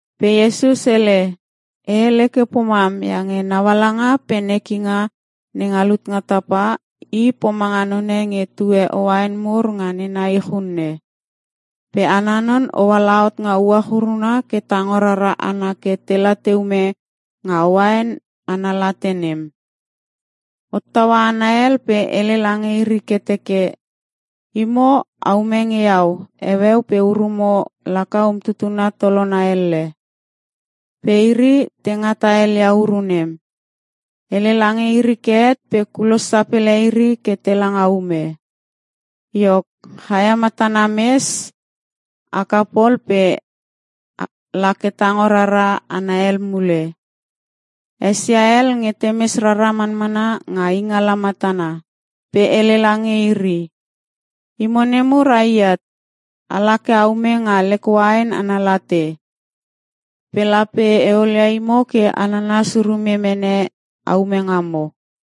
Pe Iesus hele “E hele ke pomam iange naualanga pe nekinga nenga lut nga tapa, i pomanga none nge tue uain mur nga nena ich unne. Pe ana non hoala hot nga uach uruna ke tango rara hana kela te ume nga uain ana late nem. Hottaua hana hel pe hele lange iri ke teke, ‘Imo a ume nge iau heueu pe urumo laka umtutuna tolona elle.’ Pe iri te ngata helia uru nem. Hele lange iri ke het pe kulos sapele iri ke tela nga ume. “Iok, chaia matana mes haka pol lo pe lake tango rara hana hel mule. Esia hel nge te mes rara manmana nga ingala matana pe hele lange iri, ‘Imo nemur ai at. Ala ke a ume nga lek uain ana late. Pe lape e olia imo ke nanas urume mene a ume ngamo.’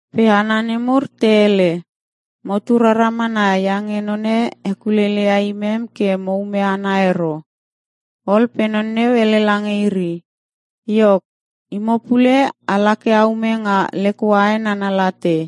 “Pe hana nemur te hele, ‘Motu rara mana iange none hekuleilei ia imem ke mo ume ana ero.’ “Ol pe non neu hele lange iri, ‘Iok, imo pule a la ke a ume nga lek uain ana late.’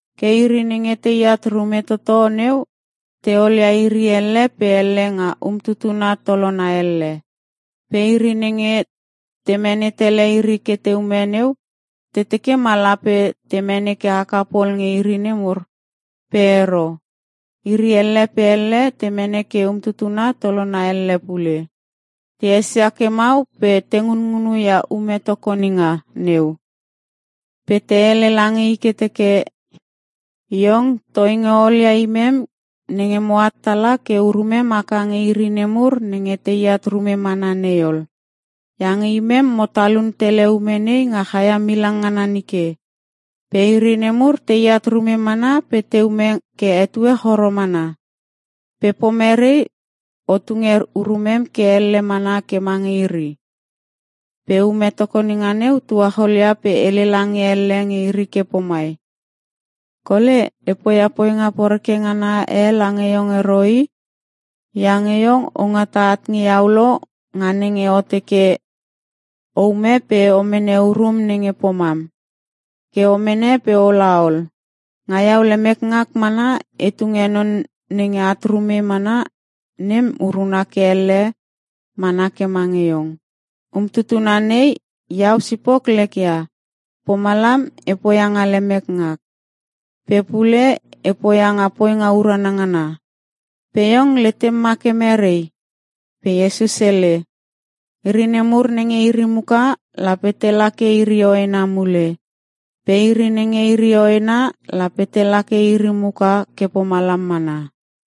“Ke iri nenge teat rume toto neu te olia iri elle pe elle nga umtutuna tolona elle. Pe iri nenge te mene tele iri ke te ume neu, te teke ma lape te mene ke haka pol nge iri nemur, pe ero. Iri elle pe elle te mene ke umtutuna tolona elle pule. Te esia ke mau pe te ngunngunu ia ume tokoninga neu. Pe te hele lange i ke te teke, ‘Iong, toinge o olia imem nenge moat tala ke urumem haka nge iri nemur nenge teat rume mana nei ol. Iange imem, mo talun tele ume nei nga chaia milang ngana nike. Pe iri nemur teat rume mana te ume ke etue choro mana. Pe pomere o tunge urumem ke elle mana ke mange iri?’ “Pe ume tokoninga neu tuachol ia pe hele lange elle nge iri ke pomai, ‘Kole, e poia poinga poreke ngana e lange iong ero i. Iange iong o ngata at nge iau lo nga nenge o teke, o ume pe o mene urum nenge pomam. Ke o mene pe o la ol. Nga iau lemek ngak mana e tunge non nenge at rume mana nem uruna ke elle mana ke mange iong. Umtutuna nei iau sipok lek ia, pomalam e poia nga lemek ngak. Pe pule e poia nga poinga urana ngana. Pe iong letem ma ke mere?’” Pe Iesus hele, “Iri nemur nenge iri muka, lape tela ke iri hoena mule pe iri nenge iri hoena, lape tela ke iri muka ke pomalam mana.”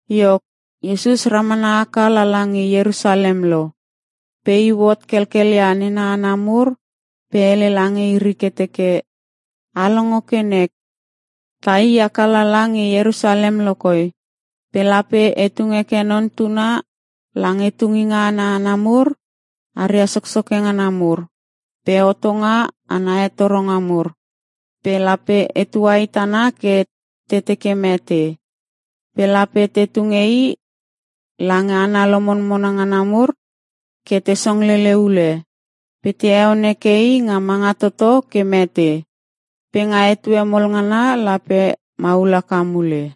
Iok, Iesus ramana haka lala nge Ierusalem lo, pe iu hot kelkel ia nena hana mur pe hele lange iri ke teke, “A longo ke nek. Tai haka lala nge Ierusalem lokoi, pe lape te tung heke Non Tuna lange tunginga ana hana mur aria soksoke ngana mur, pe hotonga ana hetoronga mur. Pe lape te tuahit ana ke te teke mete. Pe lape te tunge I lange hana lomonmona ngana mur ke te songlele ule, pe te heon heke I nga manga toto ke mete. Pe nga etue mol ngana lape maul haka mule!”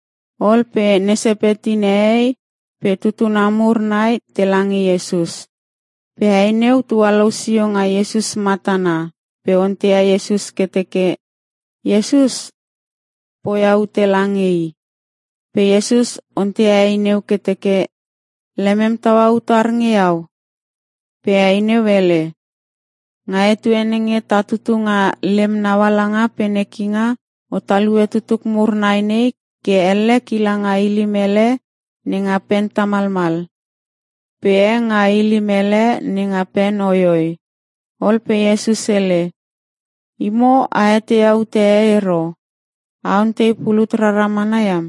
Ol pe ne Sepeti nehei pe tutuna mur nai tela nge Iesus. Pe hei neu tualou sio nga Iesus matana pe onteia Iesus ke teke Iesus poia ute lange i. Pe Iesus onteia hei neu ke teke, “Lemem taua utar nge Iau?” Pe hei neu hele, “Nga etue nenge ta tutu nga lem naualanga pe nekinga, o talue tutuk mur nai nei ke elle kila nga ilim hele nenga pen tamalmal, pe e nga ilim hele nenga pen hoihoi.” Ol pe Iesus hele, “Imo a eteia ute e ero. A ontei pulut rara mana iam.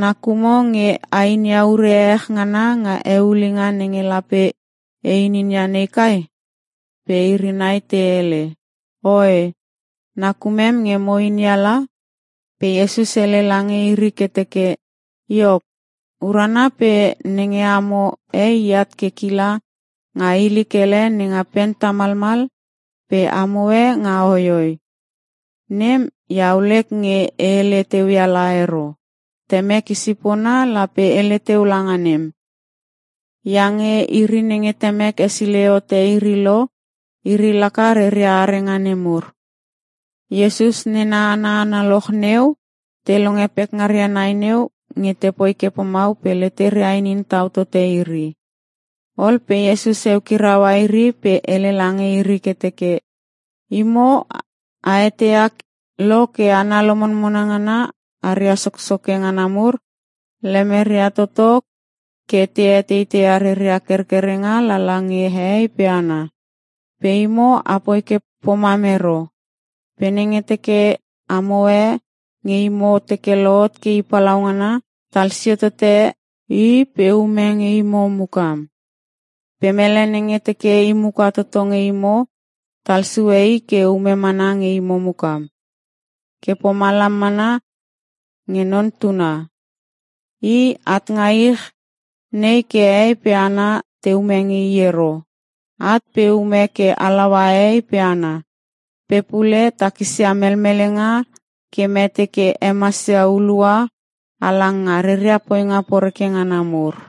Nakumo nge a inia ure ehech ngana nga eulinga nenge lape e ininia nei kai?” Pe iri nai te hele, “Oe! Nakumem nge mo inia la.” Pe Iesus hele lange iri ke teke, “Iok, urana pe nenge amo e at ke kila nga ilik hele nenga pen tamalmal pe amo e nga hoihoi, nem Iau lek nge e hele teu ia la ero. Temek i sipona lape hele teu langa nem. Iange iri nenge Temek hesilei hote iri lo, iri laka reria arenga nemur.” Iesus nena hana analoch neu te longe pekngaria nai neu nge te poi ke mau pe leteria inin tau tote iri. Ol pe Iesus eukiraua iri pe hele lange iri ke teke, “Imo a eteia lo ke hana lomonmona ngana aria soksoke ngana mur, lemeria toto ke te eteiteia reria kerkerenga lala nge hehei pe hana. Pe imo, apoi ke pomam ero. Pe nenge teke amo e nge imo teke lohot ke i palaungana, talsio tote i pe ume nge imo mukam. Pe mele nenge teke i muka toto nge imo, talsue i ke ume mana nge imo mukam. Ke pomalam mana nge Non Tuna. I, at nga ich nei ke hehei pe hana te ume nge I ero. At pe ume ke halaua hehei pe hana. Pe pule takisia melmelenga ke mete ke hemasia hulua halang nga reria poinga poreke ngana mur.”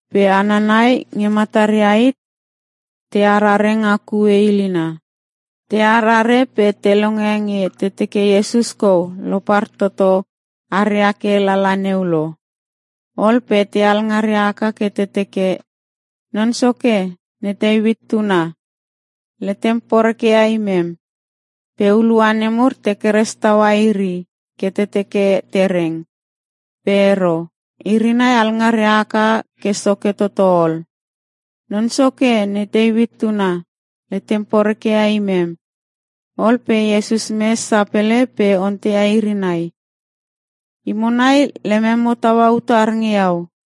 Pe hana nai nge mataria hit te arare nga kue ilina. Te arare pe te longe nge te teke Iesus kou lopar toto aria ke lala neu lo. Ol pe te alngaria haka ke te teke, “Non Soke! Ne Teuit tuna, letem poreke ia imem!” Pe hulua nemur te keres taua iri ke te teke te reng. Pe ero, iri nai alngaria haka ke soke toto ol, “Non Soke, ne Teuit tuna, letem poreke ia imem!” Ol pe Iesus mes sapele pe onteia iri nai, “Imo nai lememo taua utar nge Iau?”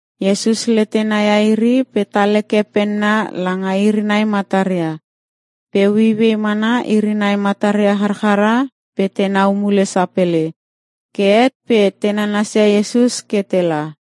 Iesus letena ia iri pe tal heke penna langa iri nai mataria. Pe ueiuei mana iri nai mataria charchara pe tenau mule sapele. Ke het pe te nanasia Iesus ke tela.